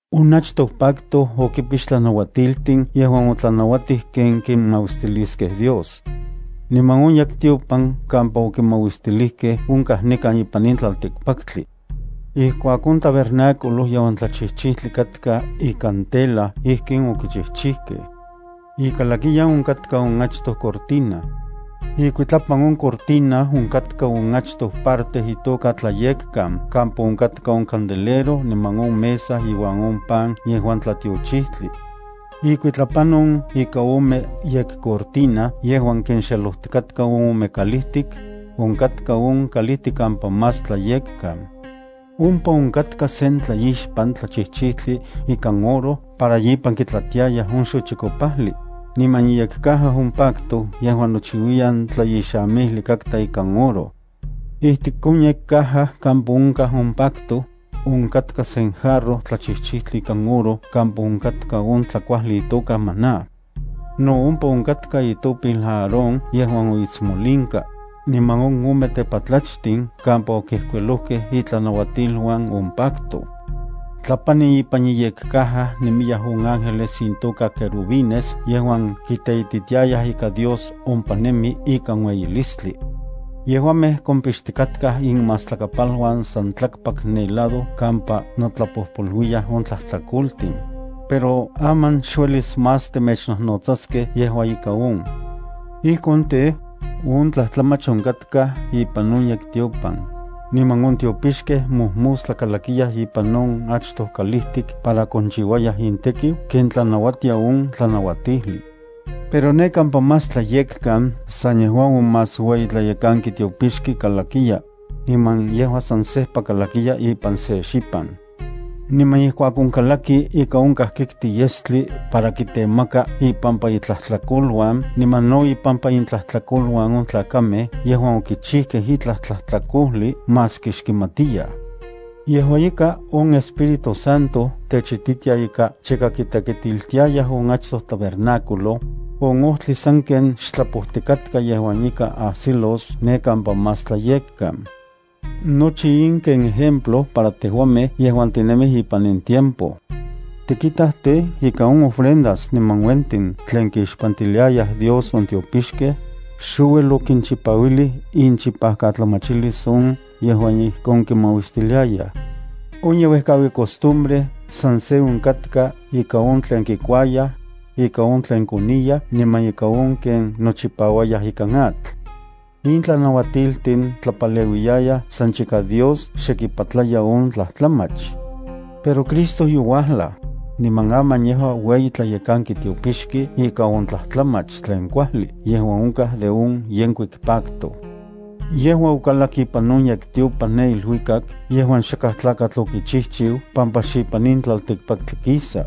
On achtoj pacto okipix tlanauatiltin yejuan otlanauatij ken kimauistiliskej Dios. Niman on yektiopan kampa okimauistilijkej onkaj nikan ipan in tlaltikpaktli. Ijkuak on tabernáculo yejuan tlachijchijtli katka ikan tela ijkin okichijchijkej. Ikalakiyan onkatka on achtoj cortina. Ikuitlapan on cortina onkatka on achtoj parte itoka Tlayekkan kampa onkatka on candelero niman on mesa iuan on pan yejuan tlatiochijtli. Ikuitlapan on ika ome yekcortina yejuan kinxelojtikaj on ome kalijtik, onkatka on kalijtik kampa más tlayekkan. Ompa onkatka sen tlaixpan tlachijchijtli ikan oro para ipan kitlatiayaj on xochikopajli, niman iyekcaja on pacto yejuan nochiuiyan tlaixamijli ikan oro. Ijtik on yekcaja kampa onkaj on pacto, onkatka se jarro tlachijchijtli ikan oro kampa onkatka on tlakuajli itoka maná. No ompa onkatka itopil Aarón yejuan oitsmolinka, niman on ome tepatlachtin kampa okijkuilojkej itlanauatiluan on pacto. Tlapani ipan iyekcaja nemiyaj on ángeles intoka querubines yejuan kiteititiayaj ika Dios ompa nemi ikan ueyilistli. Yejuamej kompixtikatkaj inmastlakapaluan san tlakpak ne lado kampa notlapojpoluiyaj on tlajtlakoltin. Pero aman xuelis más temechnojnotsaskej yejua ika on. Ijkon tej, on tlajtlamach onkatkaj ipan on yektiopan, niman on tiopixkej mojmostla kalakiyaj ipan on achtoj kalijtik para konchiuayaj intekiu ken tlanauatia on tlanauatijli. Pero ne kampa Más Tlayekkan san yejua on más ueyi tlayekanki tiopixki kalaki, niman yejua san sejpa kalakiya ipan se xipan. Niman ijkuak onkalaki ika onkaj kikti yestli para kitemaka ipampa itlajtlakoluan niman no ipampa intlajtlakoluan on tlakamej yejuan okichijkej itlaj tlajtlakojli maski xkimatiyaj. Yejua ika, on Espíritu Santo techititia ika chika kitekitiltiayaj on achtoj tabernáculo, on ojtli sanken xtlapojtikatka yejuan ika ajsilos ne kampa Más Tlayekkan. Nochi in ken ejemplo para tejuamej yejuan tinemij ipan in tiempo. Tikitaj tej, ika on ofrendas niman uentin tlen kixpantiliayaj Dios on tiopixkej, xouel okinchipauilij inchipatlamachilis on yejuan ijkon kimauistiliayaj. On yeuejkaui costumbre san se onkatka ika on tlen kikuayaj, ika on tlen koniyaj niman ika on ken nochipauayaj ikan atl. In tlanauatiltin tlapaleuiyayaj san chika Dios xe kipatlaya on tlajtlamach. Pero Cristo youajlaj, niman aman yejua ueyi tlayekanki tiopixki ika on tlajtlamach tlen kuajli yejuan onkaj de on yenkuik pacto. Yejua okalak ipan on yektiopan ne iluikak yejuan xakaj tlakatl okichijchiu pampa xipan in tlaltikpaktli kisa.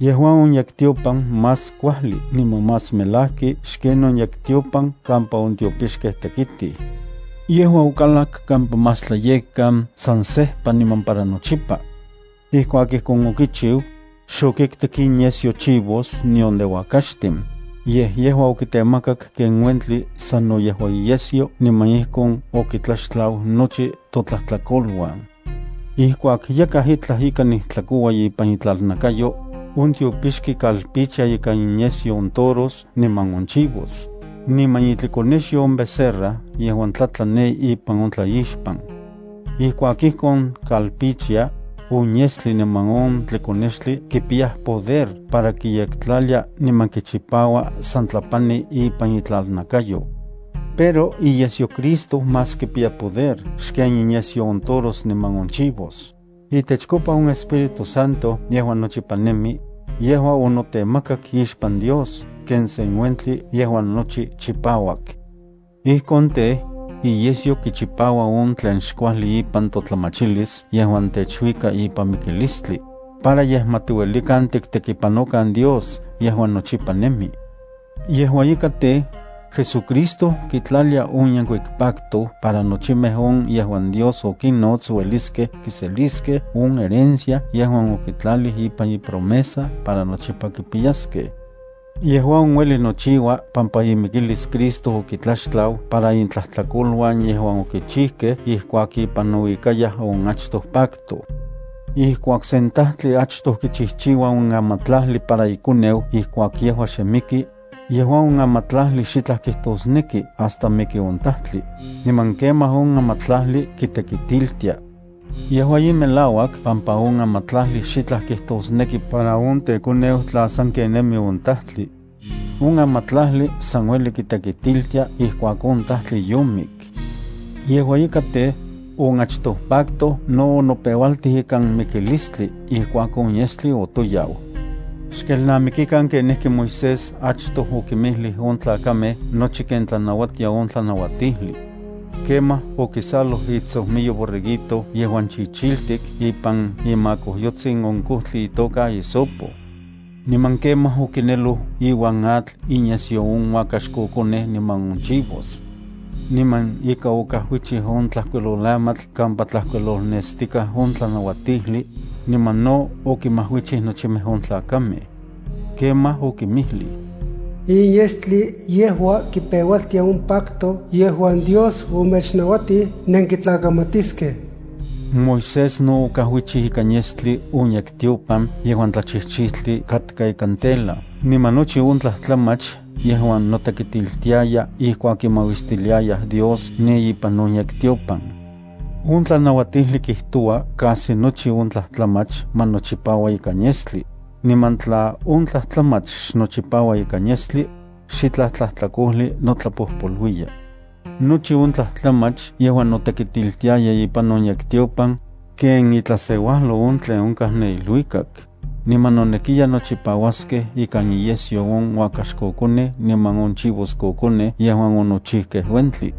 Yejua on yektiopan más kuajli niman más melajki xken on yektiopan kampa on tiopixkej tekitij. Yejua okalak kampa Más Tlayekkan san sejpa niman para nochipa. Ijkuak ijkon okichiu, xokiktik inyesyo chivos nion de uakaxtin, yej yejua okitemakak ken uentli sano yejua iyesyo niman ijkon okitlaxtlau nochi totlajtlakoluan. Ijkuak yakaj itlaj ika nijtlakoua ipan itlalnakayo, on tiopixki kalpichia ikan inyesyo on toros niman on chivos, niman itlikonexyo on becerra yejuan tlatla ne ipan on tlaixpan. Ijkuak ijkon kalpichia, on yestli niman on tlikonextli kipiyaj poder para kiyektlalia niman kichipaua san tlapani ipan itlalnakayo. Pero ¡iyesyo Cristo más kipiya poder xken inyesyo on toros niman on chivos! Itechkopa on Espíritu Santo yejuan nochipa nemi, yejua onotemakak ixpan Dios ken sen uentli yejuan nochi chipauak. Ijkon tej, iyesyo kichipaua on tlen xkuajli ipan totlamachilis yejuan techuika ipan mikilistli, para yej ma tiuelikan tiktekipanokan Dios yejuan nochipa nemi. Yejua ika tej, JesuCristo kitlalia on yenkuik pacto para nochimej on yejuan Dios okinnots ueliskej kiseliskej on herencia yejuan okitlalij ipan ipromesa para nochipa kipiyaskej. Yejua on ueli nochiua pampa imikilis Cristo okitlaxtlau para intlajtlakoluan yejuan okichijkej ijkuak ipan nouikayaj on achtoj pacto. Ijkuak sen tajtli achtoj kichijchiua on amatlajli para ikoneu ijkuak yejua xe miki, yejua on amatlajli xitlaj kijtosneki hasta miki on tajtli, niman kemaj on amatlajli kitekitiltia. Yejua in melauak pampa on amatlajli xitlaj kijtosneki para on tekoneu tla sanken nemi on tajtli. On amatlajli san ueli kitekitiltia ijkuak on tajtli yomik. Yejua ika tej, on achtoj pacto no onopeualtij ikan mikilistli ijkuak on yestli otoyau. Xkelnamikikan kenijki Moisés achtoj okinmijlij on tlakamej nochi ken tlanauatia on tlanauatijli. Kemaj okisaloj itsojmiyo borreguito yejuan chichiltik ipan imakojyotsin on kojtli itoka hisopo. Niman kemaj okineloj iuan atl inyesyo on uakaxkokonej niman on chivos. Niman ika okajuichij on tlajkuiloamatl kampa tlajkuilolnestikaj on tlanauatijli, niman no okinmajuichij nochimej on tlakamej. Kemaj okinmijlij: “In yestli, yejua kipeualtia on pacto yejuan Dios omechnauatij nenkitlakamatiskej.” Moisés no okajuichij ikan yestli on yektiopan yejuan tlachijchijtli katka ikan tela niman nochi on tlajtlamach yejuan notekitiltiaya ijkuak kimauistiliayaj Dios ne ipan on yektiopan. On tlanauatijli kijtoua casi nochi on tlajtlamach ma nochipaua ikan yestli, niman tla xnotoyaua on yestli ipan uentli, xitlaj tlajtlakojli notlapojpoluiya. Nochi on tlajtlamach yejuan notekitiltiaya ipan on yektiopan ken itlaseuajlo on tlen onkaj ne iluikak, niman nonekiya nochipauaskej ika inyesyo on uakaxkokonej niman on chivoskokonej yejuan onochijkej uentli.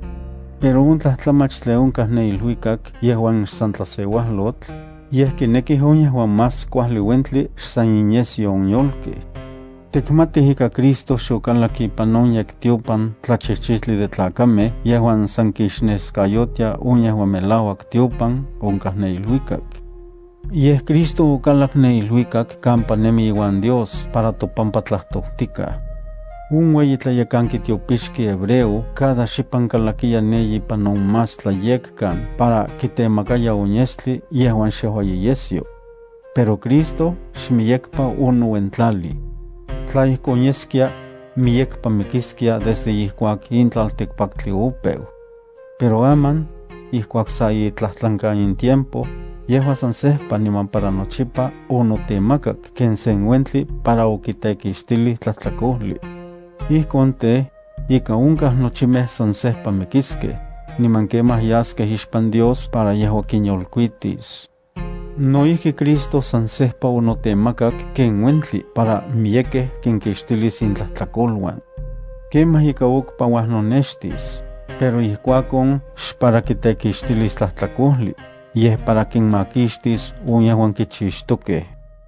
Pero on tlajtlamach tlen onkaj ne iluikak yejuan xsan tlaseuajlotl, yej kinekij on yejuan más kuajli uentli xsan iyesyo on yolkej. Tikmatij ika Cristo xokalak ipan on yektiopan tlachijchijtli de tlakamej yejuan san kixneskayotia on yejuan melauak tiopan onkaj ne iluikak. Yej Cristo okalak ne iluikak kampa nemi iuan Dios para topampa tlajtojtikaj. On ueyi tlayekanki tiopixki hebreo cada xipan kalakiya ne ipan on Más Tlayekkan para kitemakaya on yestli yejuan xejua iyesyo. Pero Cristo xmiyekpa onouentlalij. Tla ijkon yeskia, miyekpa mikiskia desde ijkuak in tlaltikpaktli opeu. Pero aman, ijkuak sa itlajtlankan in tiempo, yejua san sejpa niman para nochipa onotemakak ken sen uentli para okitekixtilij tlajtlakojli. Ijkon tej, ika onkaj nochimej san sejpa mikiskej, niman kemaj yaskej ixpan Dios para yejua kinyolkuitis. No ijki Cristo san sejpa onotemakak ken uentli para miyekej kinkixtilis intlajtlakoluan. Kemaj ika okpa uajnonextis, pero ijkuakon xpara kitekixtilis tlajtlakojli, yej para kinmakixtis on yejuan kichixtokej.